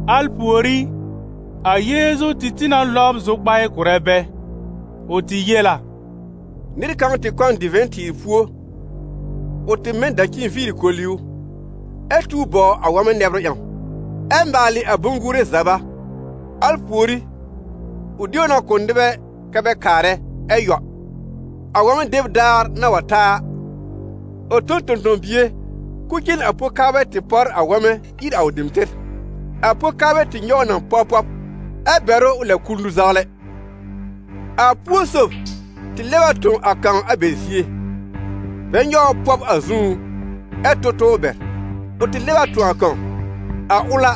Al pùorí, a Yeezu tɩ tĩ na lɔbr zʋkpaɩ kʋ̀rɛ bɛ. Ʋ tɩ yel a: «Nɩr kãw tɩ kɔ n divɛ̃-tɩɩr púo. Ʋ tɩ mɛ n dacin viiri koli ʋ, ɛ tuw bɔw a wɔ̃mɛ nɛbrʋ ƴãw, ɛ maalɩ a bʋ̃-gùre zaba. Al pùorí, ʋ de ʋ na kʋ̀ nɩbɛ kɛ́ bɛ kaarɛ, ɛ yɔ. A wɔ̃mɛ deb daar na wa ta a, ʋ tõ n tõ-tõ-bie k'ʋʋ cen a po-kaarbɛ tɩ pɔr a wɔ̃mɛ ír a ʋ dem tɩr. A po-kaarbɛ tɩ nyɔw ʋ na pɔb pɔb, ɛ bɛr ʋ ʋ lɛb kul nũ-zawlɛ. A púo sob tɩ lɛb a tõ a kãw a bɛ zie, bɛ nyɔw ʋ pɔb a zũú, ɛ tʋ tʋ bɛr. Ʋ tɩ lɛb a tõ a kãw. A ʋl a,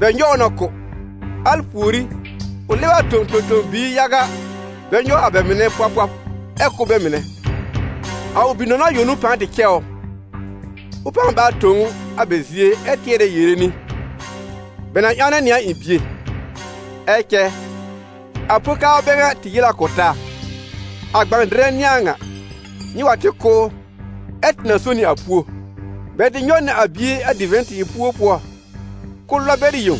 bɛ nyɔw ʋ na kʋ́. Al pùorí, ʋ lɛb a tõ tõ-tõ-biir yaga, bɛ nyɔw a bɛ mɩnɛ pɔb pɔb, ɛ kʋ́ bɛ mɩnɛ. A ʋ bi-nɔna yõ n'ʋ pãa tɩ cɛ ʋ. Ʋ pãa báa tõ ʋ a bɛ zie ɛ tɩɛrɛ yere nɩ: ‹Bɛ na ƴãwnɛ nɩ a ɩ̃ bie.› Ɛ cɛ a po-kaarbɛ bɛ ŋa tɩ yel a kʋ̀ taa: ‹A gbã-dɩrɛ n'ɩ a ŋa! Nyɩ wa tɩ kʋ́ ʋ, ɛ tɩ na so nɩ a púo.› Bɛ tɩ nyɔw nɩ a bie a divɛ̃-tɩɩr púo pʋɔ kʋ́ lɔb bɛr yẽw.»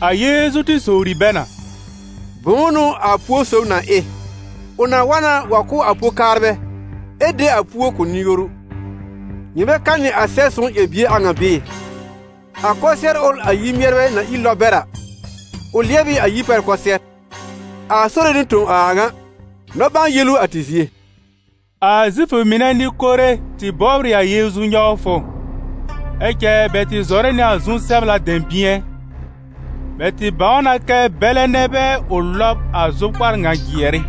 A Yeezu tɩ sowri bɛ na: «Bʋ̃ʋ n'ʋ a púo sob na ɩ? Ʋ na wa na wa kʋ́ a po-kaarbɛ ɛ de a púo kʋ̀ nɩ-yoru. Nyɩ bɛ kanɩ a Sɛb-sõw ƴɛr-bie a ŋa bɩɩ? ‹A kʋsɩɛr ʋl a yir-mɩɛrbɛ na ír lɔb bɛr a, ʋ lɩɛb ɩ a yir pɛr kʋsɩɛr. A Sore n'ʋ tõ a a ŋa: nɔ-ɓãa-yel ʋ a tɩ zie.›» A Zifʋ mɩnɛ Nɩ-kore tɩ bɔbr ɩ a Yeezu nyɔwfʋ, ɛ cɛ bɛ tɩ zɔrɛ nɩ a zu-sɛbla dɛ̃bɩ̃ɛ. Bɛ tɩ bãw na kɛ bɛlɛ nɛ bɛ ʋ lɔb a zʋkpar ŋa jɩɛr ɩ.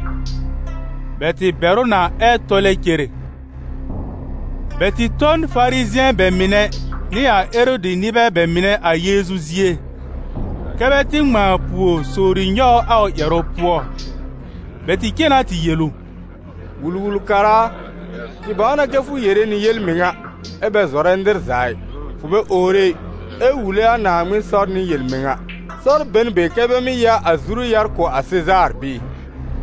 Bɛ tɩ bɛr ʋ na ɛ tɔlɛ cere. Bɛ tɩ tõ n Farizɩ̃ɛ bɛ mɩnɛ nɩ a Erɔdɩ nɩbɛ bɛ mɩnɛ a Yeezu zie, kɛ́ bɛ tɩ ŋmãa pùor sowri nyɔw ʋ a ʋ ƴɛrʋ pʋɔ. Bɛ tɩ cen na tɩ yel ʋ: «Wul-wul-kara a, tɩ bãw na kɛ fʋ yere nɩ yel-mɩŋa, ɛ bɛ zɔrɛ nɩr za ɩ: fʋ bɛ owre ɩ, ɛ wule a Naaŋmɩn sɔr nɩ yel-mɩŋa. Sɔr be n be kɛ bɛ mɩ́ ya a zuru-yar kʋ̀ a Sezaar bɩɩ?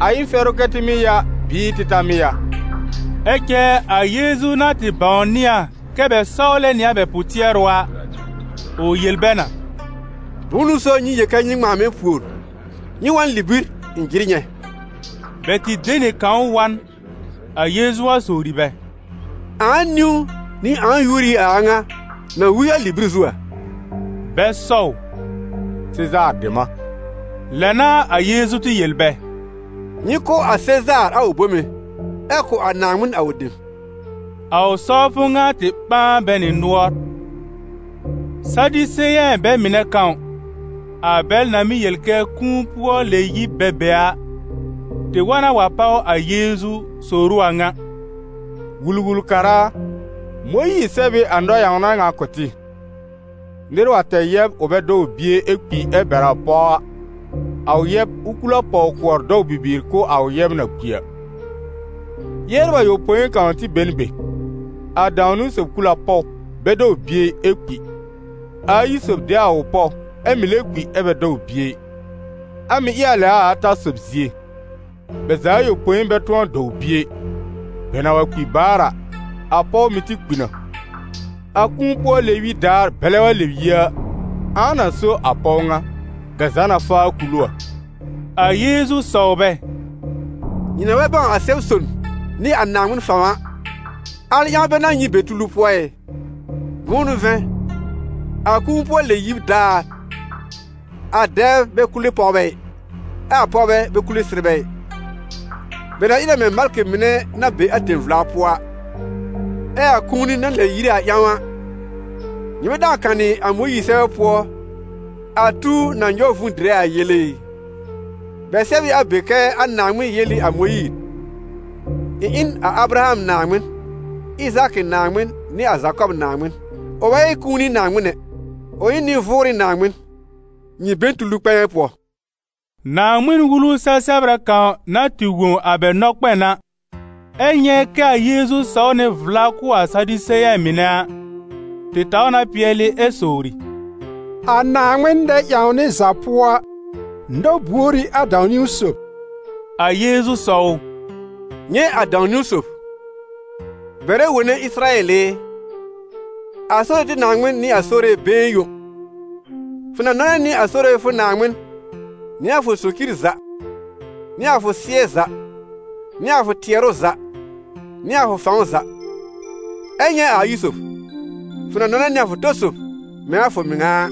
A ɩ n fɛrʋ kɛ tɩ mɩ́ ya bɩɩ tɩ ta mɩ́ ya?» Ɛ cɛ a Yeezu na tɩ bãwnɩ a kɛ bɛ sɔwlɛ nɩ a bɛ pʋ-tɩɛrʋ a, ʋ yel bɛ na: «Bʋ̃ʋ n'ʋ so nyɩ yel kɛ nyɩ ŋmãa mɛ̃ pùor? Nyɩ wa n libir ɩ̃ jɩr nyɛ̃!» Bɛ tɩ de nɩ kãw wa n, a Yeezu wa sowri bɛ: «Ãa niwn nɩ ãa yúor ɩ a a ŋa na wi a libir zu a?» Bɛ sɔw: «Sezaar dem a!» Lɛ n'a a Yeezu tɩ yel bɛ: «Nyɩ kʋ̀ a Sezaar a ʋ bome, ɛ kʋ̀ a Naaŋmɩn a ʋ dem.» A ʋ sɔwfʋ ŋa tɩ ɓãa bɛ nɩ nʋɔr. Sadiseyɛ̃ bɛ mɩnɛ kãw, a bɛl na mɩ́ yel kɛ kũu-pʋɔ-lɛ-yib bɛ be a, tɩ wa na wa páw a Yeezu sowr ʋ a ŋa: «Wul-wul-kara a, Mõyiir sɛb ɩ a nɔ-ƴãwna ŋa kʋ̀ tɩ: ‹Nɩr wa tɛr yɛb ʋ bɛ dɔw bie, ɛ kpi ɛ bɛr a pɔw a, a ʋ yɛb, ʋ kul a pɔw-kʋɔr dɔw bibiir kʋ̀ a ʋ yɛb na kpi a.› Yɛbr ayopõi kãw tɩ be n be. A dãw-niwn sob kul a pɔw, bɛ dɔw bie ɩ, ɛ kpi. A ayi sob de a ʋ pɔw, ɛ́ mɩ̀ lɛ kpi ɛ bɛ dɔw bie ɩ. A mɩ̀ ɩ a lɛ a ata sob zie. Bɛ za ayopõi bɛ tʋ̃ɔ dɔw bie ɩ. Bɛ na wa kpi baar a, a pɔw mɩ̀ tɩ kpi na. A kũu-pʋɔ-lɛ-yib daar bɛlɛ wa lɛb yi a, ãa na so a pɔw ŋa, bɛ za na faa kul ʋ a?» A Yeezu sɔw bɛ: «Nyɩ na bɛ bãw a Sɛb-son nɩ a Naaŋmɩn fãw a, al ƴãw bɛ n'a nyɩ be tulu pʋɔ ɩ? Bʋ̃ʋ n'ʋ vɛ̃, a kũu-pʋɔ-lɛ-yib daar, a dɛbr bɛ kule pɔwbɛ ɩ, ɛ a pɔwbɛ bɛ kule sɩrbɛ ɩ, bɛ na ɩ na mɛ̃ malkɩ mɩnɛ na be a tẽ-vla pʋɔ a. Ɛ a kũuni na lɛb yire a ƴãw a, nyɩ bɛ dãw kanɩ a Mõyiir sɛbɛ pʋɔ a tuw na nyɔw vũu dɩrɛ a yele ɩ? Bɛ sɛb ɩ a be kɛ a Naaŋmɩn yel ɩ a Mõyiir: ‹Ɩ̃ ɩ n a Abraham Naaŋmɩn, Ɩzaakɩ Naaŋmɩn nɩ a Zakɔb Naaŋmɩn.› Ʋ bɛ ɩ kũuni Naaŋmɩn ɛ, ʋ ɩ n nɩ-vʋʋrɩ Naaŋmɩn. Nyɩ be n tulu kpɛ̃ɛ pʋɔ.» Naaŋmɩn-wulu sɛ-sɛbrɛ kãw na tɩ wõ a bɛ nɔkpɛn a, ɛ nyɛ̃ kɛ a Yeezu sɔw nɩ vla kʋ̀ a Sadiseyɛ̃ mɩnɛ a, tɩ taw na pɩɛlɩ ɛ sowri: «A Naaŋmɩn nɛ-ƴãwnɩ za pʋɔ a, nɔ-buor ɩ a dãw-niwn sob?» A Yeezu sɔw ʋ: «Nyɛ̃ a dãw-niwn sob: ‹Bɛrɛ wone Ɩsɩrayɛl ɩ, a Sore tɩ Naaŋmɩn n'ɩ a Sore been yõ. Fʋ na nɔnɛ nɩ a Sore fʋ Naaŋmɩn nɩ a fʋ socir za, nɩ a fʋ sɩ́ɛ za, nɩ a fʋ tɩɛrʋ za, nɩ a fʋ fãw za.› Ɛ nyɛ̃ a ayi sob: ‹Fʋ na nɔnɛ nɩ a fʋ tɔ sob mɛ̃ a fʋ mɩŋa a.›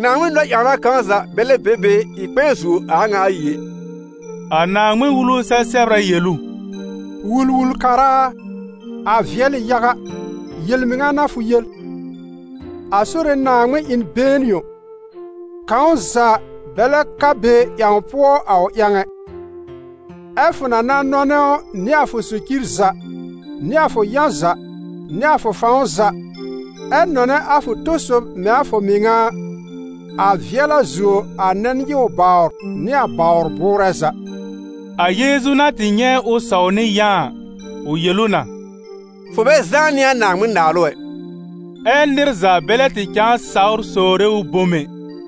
Naaŋmɩn nɔ-ƴãwna kãw za bɛ lɛb be be ɩ kpɛ̃ɛ zuo a a ŋa ayi ɛ.» A Naaŋmɩn-wulu sɛ-sɛbrɛ yel ʋ: «Wul-wul-kara a, a vɩɛl ɩ yaga, yel-mɩŋa n'a fʋ yel: a Sore Naaŋmɩn ɩ n been yõ, kãw za bɛ lɛb ka be ƴãw pʋɔ a ʋ ƴãw ɛ. Ɛ fʋ na na nɔnɛ ʋ nɩ a fʋ socir za, nɩ a fʋ yã za, nɩ a fʋ fãw za, ɛ nɔnɛ a fʋ tɔ sob mɛ̃ a fʋ mɩŋa a, a vɩɛl a zuo a nɛn-nyɩw-bawr nɩ a bawr bʋʋrɛ za.» A Yeezu na tɩ nyɛ̃ ʋ sɔw nɩ yã a, ʋ yel ʋ na: «Fʋ bɛ zãá nɩ a Naaŋmɩn-Naalʋ ɛ!» Ɛ nɩr za bɛ lɛ tɩ cãa sawr sowre ʋ bom ɛ.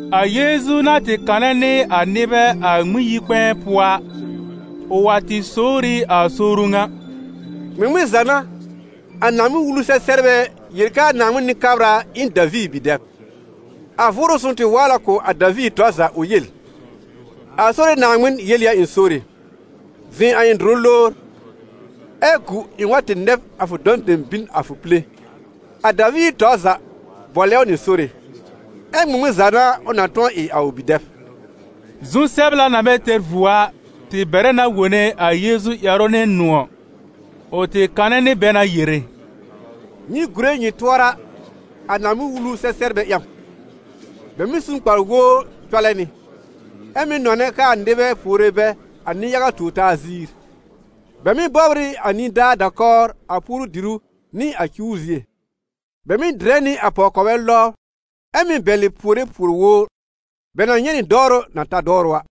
A Yeezu na tɩ kanɛ nɩ a nɩbɛ a Ŋmɩn-yi-kpɛ̃ɛ pʋɔ a, ʋ wa tɩ sowr ɩ a sowru ŋa: «Ŋmɩŋmɩn za n'a a Naaŋmɩn-Wulu-sɛ-sɛbrbɛ yel kɛ a Naaŋmɩn Nɩ-kabra ɩ n Daviir bi-dɛb? A Vʋʋrʋ Sõw tɩ waal a kʋ̀ a Daviir tɔr za ʋ yel: ‹A Sore Naaŋmɩn yel ɩ a ɩ̃ Sore: zɩ̃ a ɩ̃ dʋrʋ lowr, ɛ́ gu ɩ̃ wa tɩ nɛb a fʋ dɔ̃ dem bin a fʋ pile.› A Daviir tɔr za bʋɔlɛ ʋ nɩ Sore, ɛ ŋmɩŋmɩn za n'a ʋ na tʋ̃ɔ ɩ a ʋ bi-dɛb?» Naaŋmɩn-Wulu-sɛ-sɛbrbɛ ƴãw Zu-sɛbla na bɛ tɛr vuo a, tɩ bɛrɛ na wone a Yeezu ƴɛrʋ nɩ nʋ̃ɔ̀. Ʋ tɩ kanɛ nɩ bɛ na yere: «Nyɩ gùre nyɩ tʋɔra a Naaŋmɩn-Wulu-sɛ-sɛbrbɛ ƴãw, bɛ mɩ́ su n kpar-wowr cɔlɛ nɩ, ɛ mɩ́ nɔnɛ kɛ a nɩbɛ puore bɛ a nɩ-yaga tuor-taa ziir; bɛ mɩ́ bɔbr ɩ a nidaa da-kɔwr a puoru-dìrú nɩ a cuwr zie; bɛ mɩ́ dɩrɛ nɩ a pɔw-kɔbɛ lɔbr, ɛ mɩ́ bɛlɩ puore puor-wowr. Bɛ na nyɛ̃ nɩ dɔwrʋ na ta dɔwrʋ a!»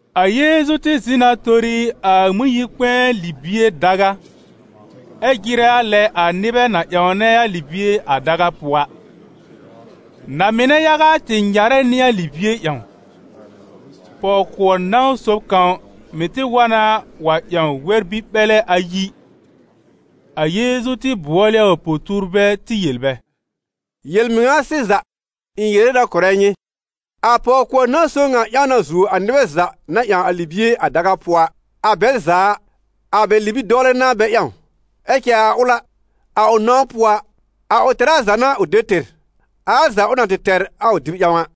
A Yeezu tɩ zɩ̃ na tori a Ŋmɩn-yi-kpɛ̃ɛ libie daga, ɛ jɩrɛ a lɛ a nɩbɛ na ƴãwnɛ a libie a daga pʋɔ a. Na-mɩnɛ yaga tɩ nyarɛ nɩ a libie ƴãwn. Pɔw-kʋɔr nãw sob kãw mɩ̀ tɩ wa na wa ƴãw wɛr-bi-ɓɛlɛ ayi. A Yeezu tɩ bʋɔl ɩ a ʋ po-tuurbɛ tɩ yel bɛ: «Yel-mɩŋa sɩza, ɩ̃ yere na kʋ̀rɛ nyɩ, a pɔw-kʋɔr nãw sob ŋa ƴãw na zuo a nɩbɛ za na ƴãw a libie a daga pʋɔ a. A bɛl za a, a bɛ libi-dɔwlɛ n'a bɛ ƴãw, ɛ cɛ a ʋl a, a ʋ nãw pʋɔ a, a ʋ tɛra za n'a ʋ de tɩr, a al za ʋ na tɩ tɛr a ʋ dɩb ƴãw a.»